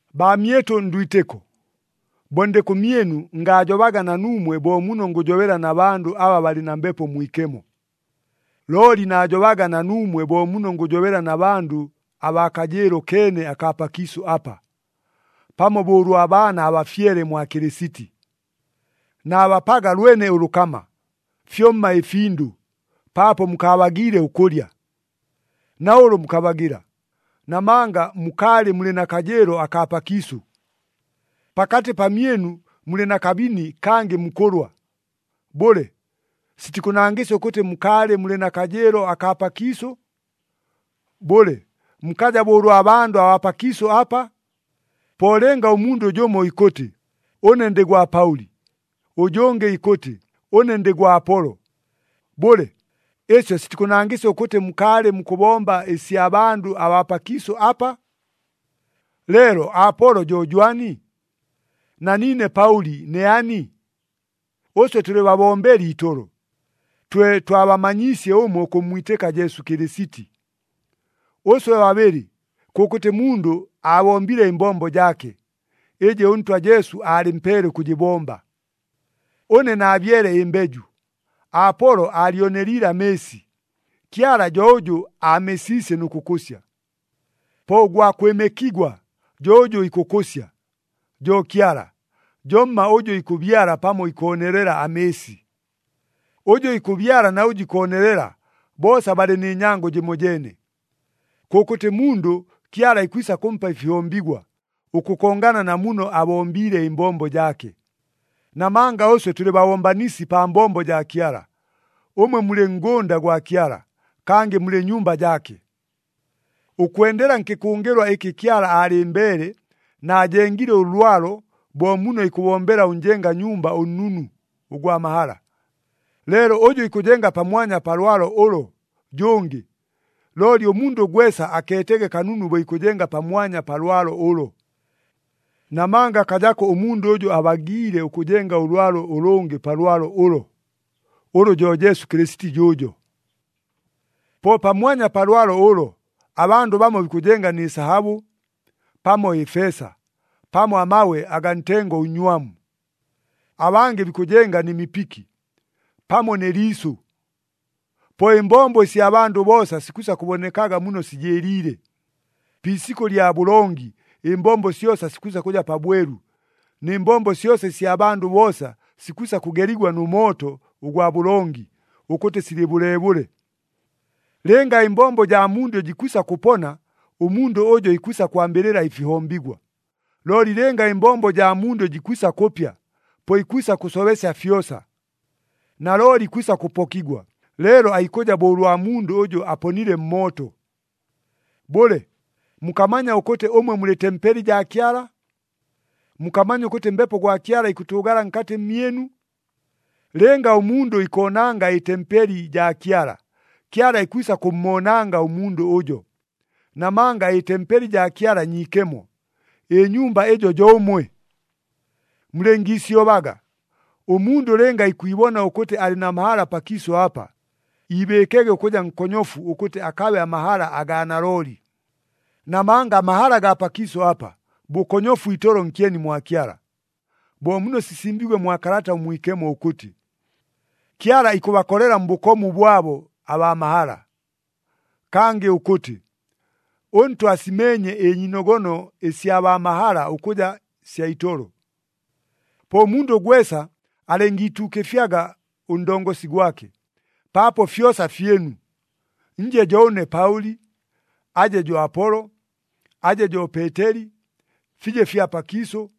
Baamyɨtʉ ndwitɨko, bo ndɨ kʉmyɨnu ngaajobaga na nuumwe bo muno ngʉjobela na bandʉ aba balɨ na Mbepo Mwikemo. Looli naajobaga na nuumwe bo muno ngʉjobela na bandʉ abaa kajɨɨlo keene akaa pakiisʉ apa, pamo bo ʉlwa baana abafyele mwa Kɨlɨsiti. Naabapaga lwene ʉlʉkama, fyomma ɨfindʉ, paapo mukaabagiile ʉkʉlya. Na ʉlʉ mukabagɨla. Namanga mukaalɨ mulɨ na kajɨɨlo akaa pakiisʉ. Pakatɨ pamyɨnu mulɨ na kabini kangɨ mukʉlwa. Bʉle, sitikʉnangɨsya ʉkʉtɨ mukaalɨ mulɨ na kajɨɨlo akaa pakiisʉ? Bʉle, mukaja bo ʉlwa bandʉ abaa pakiisʉ apa? Po lɨnga ʉmundʉ jʉmo ikʉtɨ, “Ʉne ndɨ gwa Paʉli,” ʉjʉngɨ ikʉtɨ, “Ʉne ndɨ gwa Apolo,” bʉle, ɨsyo sitikʉnangɨsya ʉkʉtɨ mukaalɨ mukʉbomba ɨsya bandʉ abaa pakiisʉ apa? Leelo Apolo jo jwani? Na niine Paʉli ne ani? Ʉswe tʉlɨ babombeli itolo, twe twabamanyiisye ʉmwe ʉkʉmmwitɨka Jesu Kɨlɨsiti. Ʉswe babɨlɨ, kʉkʉtɨ mundʉ aabombile ɨmbombo jaake, ɨjɨ ʉNtwa Jesu aalɨmpeele ʉkʉjɨbomba. Ʉne naabyele ɨmbeju, Apolo aalyoneliile amɨɨsi, Kyala jo ʉjʉ aamesiisye nʉ kʉkʉsya. Po ʉgwa kwɨmɨkigwa jo ʉjʉ ikʉkʉsya, jo Kyala, jomma ʉjʉ ikʉbyala pamo ikoonelela amɨɨsi. Ʉjʉ ikʉbyala na ʉjʉ ikoonelela, boosa balɨ nɨ nyango jɨmojeene. Kʉkʉtɨ mundʉ Kyala ikwisa kʉmpa ɨfihombigwa, ʉkʉkongana na muno abombiile ɨmbombo jaake. Namanga ʉswe tʉlɨ babombanisi pa mbombo jaa Kyala. Ʉmwe mulɨ ngʉnda gwa Kyala, kangɨ mulɨ nyumba jaake. Ʉkwendela nkɨkʉngɨlwa ɨkɨ Kyala aalɨmbeele, naajengile ʉlwalo bo muno ikʉbombela ʉnjenga nyumba ʉnnunu, ʉgwa mahala. Leelo ʉjʉ ikʉjenga pamwanya pa lwalo ʉlo, jʉngɨ. Looli ʉmundʉ gwesa akeetege kanunu bo ikʉjenga pamwanya pa lwalo ʉlo. Namanga akajako ʉmundʉ ʉjʉ abagiile ʉkʉjenga ʉlwalo ʉlʉngɨ pa lwalo ʉlo, ʉlʉ jo Jesu Kɨlɨsiti jʉʉjo. Po pamwanya pa lwalo ʉlo, abandʉ bamo bikʉjenga nɨ sahabʉ, pamo ɨfeesa, pamo amabwe agaa ntengo ʉnnywamu. Abangɨ bikʉjenga nɨ mipiki, pamo nɨ liisʉ. Po ɨmbombo ɨsya bandʉ boosa sikwisa kʉbonekaga muno sijɨɨliile. Pi isikʉ lya bʉlongi ɨmbombo syosa sikwisa kʉja pabwelu, nɨ mbombo syosa ɨsya bandʉ boosa sikwisa kʉgeligwa nʉ mooto ʉgwa bʉlongi, ʉkʉtɨ silɨ bʉleebʉle. Lɨnga ɨmbombo jaa mundʉ jikwisa kʉpona, ʉmundʉ ʉjo ikwisa kwambɨlɨla ɨfihombigwa. Looli lɨnga ɨmbombo jaa mundʉ jikwisa kʉpya, po ikwisa kʉsobesya fyosa. Nalooli ikwisa kʉpokigwa, leelo aikʉja bo ʉlwa mundʉ ʉjʉ aponile mmooto. Bʉle, mukamanya ʉkʉtɨ ʉmwe mulɨ tempeli jaa Kyala? Mukamanya ʉkʉtɨ Mbepo gwa Kyala ikʉtʉʉgala nkatɨ mmyɨnu? Lɨnga ʉmundʉ ikoonanga ɨtempeli jaa Kyala, Kyala ikwisa kʉmmoonanga ʉmundʉ ʉjo. Namanga ɨtempeli jaa Kyala nyiikemo, ɨnyumba ɨjo jo ʉmwe. Mulɨngiisyobaga. Ʉmundʉ lɨnga ikwibona ʉkʉtɨ alɨ na mahala pakiisʉ apa, iibɨɨkege ʉkʉja nkonyofu ʉkʉtɨ akabe amahala agaa nalooli. Namanga amahala gaa pakiisʉ apa, bʉkonyofu itolo nkyeni mwa Kyala. Bo muno sisimbiigwe mwa Kalata ʉMwikemo ʉkʉtɨ, “Kyala ikʉbakolela mbʉkomu bwabo abaa mahala.” Kangɨ ʉkʉtɨ, “ɄNtwa asimeenye ɨnyiinogono ɨsya baa mahala ʉkʉja sya itolo.” Po mundʉ gwesa alɨngiituukɨfyaga ʉndongosi gwake. Paapo fyosa fyɨnu, nje jo ʉne Paʉli, aje jo Apolo, aje jo Peeteli, fije fya pakiisʉ,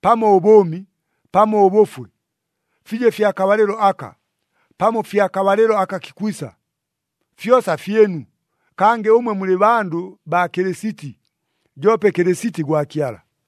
pamo ʉbʉʉmi, pamo ʉbʉfwe, fije fya kabalɨlo aka, pamo fya kabalɨlo aka kikwisa. Fyosa fyɨnu, kangɨ ʉmwe mulɨ bandʉ baa Kɨlɨsiti, joope Kɨlɨsiti gwa Kyala.